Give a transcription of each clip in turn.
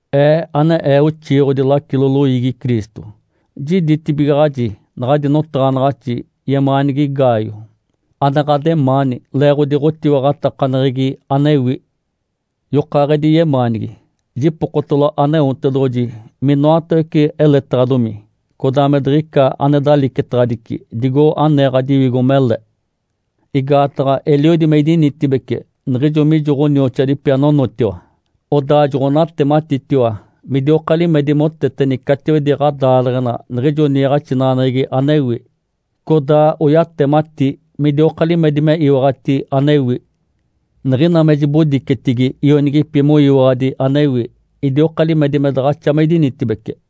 Ee ane ee oxiiɡ̶odi lacilo loiigi Cristo, jiditibigaɡ̶aji naɡ̶adi notaɡ̶anaɡ̶axi, yemaanigi Gaio, ane ɡ̶ademaani leeɡ̶odi ɡ̶otiwaɡ̶atakaneɡ̶egi anewi. Yokaaɡ̶edi yemaanigi, jipokotalo Aneotedoɡ̶oji minoatawece eletedaɡ̶adomi, codaa me diɡ̶icata ane dalicetaɡ̶adici, digo anee ɡ̶adiwigo mele. Igaataɡ̶a eliodi me idinitibece niɡ̶ijo mijo ɡ̶onioxoadipi anonotiwa, odaa joɡ̶onatematitiwa midioka limedi moteteni catiwedi ɡ̶adaaleɡ̶ena niɡ̶ijo niiɡ̶axinaɡ̶aneɡ̶egi anewi, codaa oyatemati midioka limedi me iwaɡ̶ati anewi. Niɡ̶ina me jibodicetigi ionigipi moyiwaɡ̶adi anewi, idioka limedi me daɡ̶axa me idinitibece.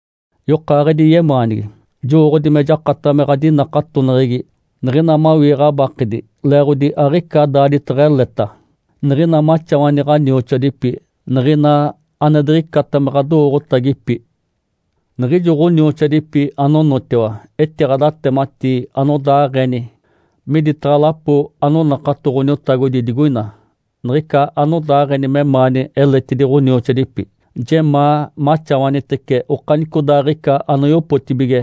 Yokaaɡ̶edi yemaanigi, jowooɡ̶odi me jakataɡ̶a me ɡ̶adinakatoneɡ̶egi niɡ̶ina mawii ɡ̶abakedi leeɡ̶odi aɡ̶ica daaditeɡ̶eleta, niɡ̶ina maxawani ɡ̶onioxoadipi, niɡ̶ina ane diɡ̶icata me ɡ̶adowooɡ̶otagipi. Niɡ̶ijo ɡ̶onioxoadipi anonotiwa etiɡ̶adatematii anodaaɡ̶eni miditaɡ̶a lapo anonakato Ǥoniotagodi digoina, niɡ̶ica anodaaɡ̶eni memaani eletidi ɡ̶onioxoadipi. Jemaa maxawanitece okanicodaaɡ̶ica anoyopotibige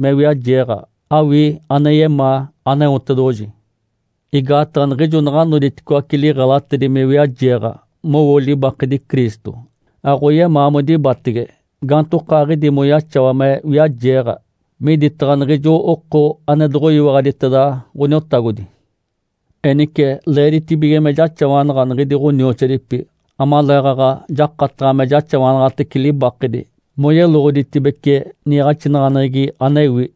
me wiajeeɡ̶a, awii ane yemaa Aneotedoɡ̶oji. Igaataɡ̶a niɡ̶ijo naɡ̶a noditicoaci liɡ̶elatedi me wiajeeɡ̶a, mowo libakedi Cristo, aɡ̶oyemaa modibatege gaantokaaɡ̶idi moyaxawa me wiajeeɡ̶a miditaɡ̶a niɡ̶ijo oko ane doɡ̶oyiwaɡ̶aditeda Ǥoniotagodi. Enice leeditibige me jaxawanaɡ̶a niɡ̶idi ɡ̶onioxoadipi, amaleeɡ̶aɡ̶a jakataɡ̶a me jaxawanaɡ̶atece libakedi moyeloɡ̶oditibece niiɡ̶axinaɡ̶aneɡ̶egi anewi.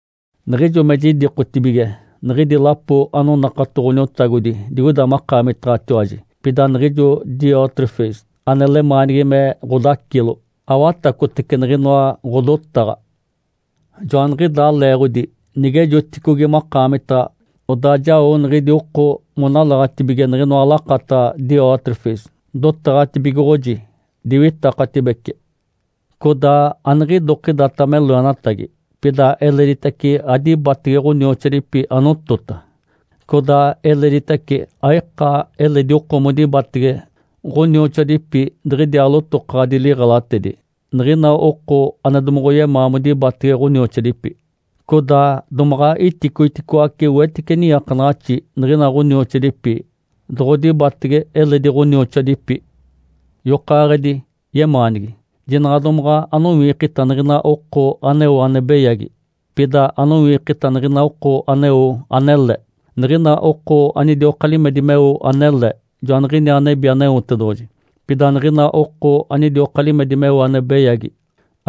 Jiɡ̶ijo me jidikotibige niɡ̶idi lapo anonakato Ǥoniotagodi digoida makaamitaɡ̶atiwaji, pida niɡ̶ijo Diótrefes ane lemaanigi me ɡ̶odacilo, awatacotece niɡ̶inoa ɡ̶odotaɡ̶a. Joaniɡ̶idaa leeɡ̶odi nigejoticogi makaamitaɡ̶a, odaa jao niɡ̶idi oko monalaɡ̶atibige niɡ̶inoa lakataɡ̶a Diótrefes. Dotaɡ̶atibigoɡ̶oji, diwitakatibece. Codaa aniɡ̶idokidata me loenatagi, pida eleditace adibatege ɡ̶onioxoadipi anotota, codaa eleditace aika eledi oko modibatege ɡ̶onioxoadipi diɡ̶idiaa lotokaɡ̶adi liɡ̶elatedi, niɡ̶ina oko ane domoɡ̶oyemaa modibatege ɡ̶onioxoadipi. Codaa domaɡ̶a iticoiticoace wetice niiakanaɡ̶axi niɡ̶ina ɡ̶onioxoadipi doɡ̶odibatege eledi ɡ̶onioxoadipi. Yokaaɡ̶edi yemaanigi, jinaɡ̶a domaɡ̶a anowiikita niɡ̶ina oko aneo ane beyagi, pida anowiikita niɡ̶ina oko aneo anele. Niɡ̶ina oko anidioka limedi meo anele, joaniɡ̶iniaa nebi Aneotedoɡ̶oji. Pida niɡ̶ina oko anidioka limedi meo ane beyagi,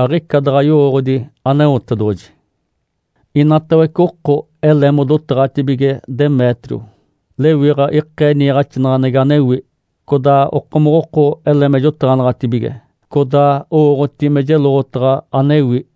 aɡ̶ica daɡ̶a yowooɡ̶odi Aneotedoɡ̶oji. Inatawece oko ele modotaɡ̶atibige Demétrio. Lewiɡ̶a ikee niiɡ̶axinaɡ̶aneɡ̶egi anewi. Codaa okomoɡ̶oko ele me jotaɡ̶anaɡ̶atibige, codaa owooɡ̶oti me jeloɡ̶otaɡ̶a anewi.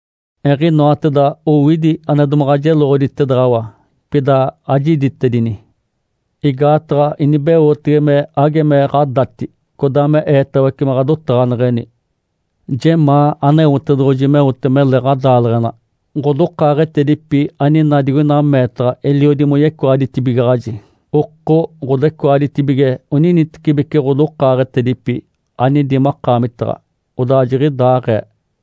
Eɡ̶inoateda owidi ane domaɡ̶a jeloɡ̶oditedaɡ̶awa, pida ajiditedini. Igaataɡ̶a inibeotege me age me ɡ̶adati, codaa me eetawece me ɡ̶adotaɡ̶aneɡ̶eni. Jemaa Aneotedoɡ̶oji meote mele ɡ̶adaaleɡ̶ena. Ǥodokaaɡ̶etedipi anina digoina meetaɡ̶a eliodi moyecoaditibigaɡ̶aji. Oko ɡ̶odecoaditibige oninitecibeci ɡ̶odokaaɡ̶etedipi anidi makaamitaɡ̶a. Odaa jiɡ̶idaaɡ̶ee.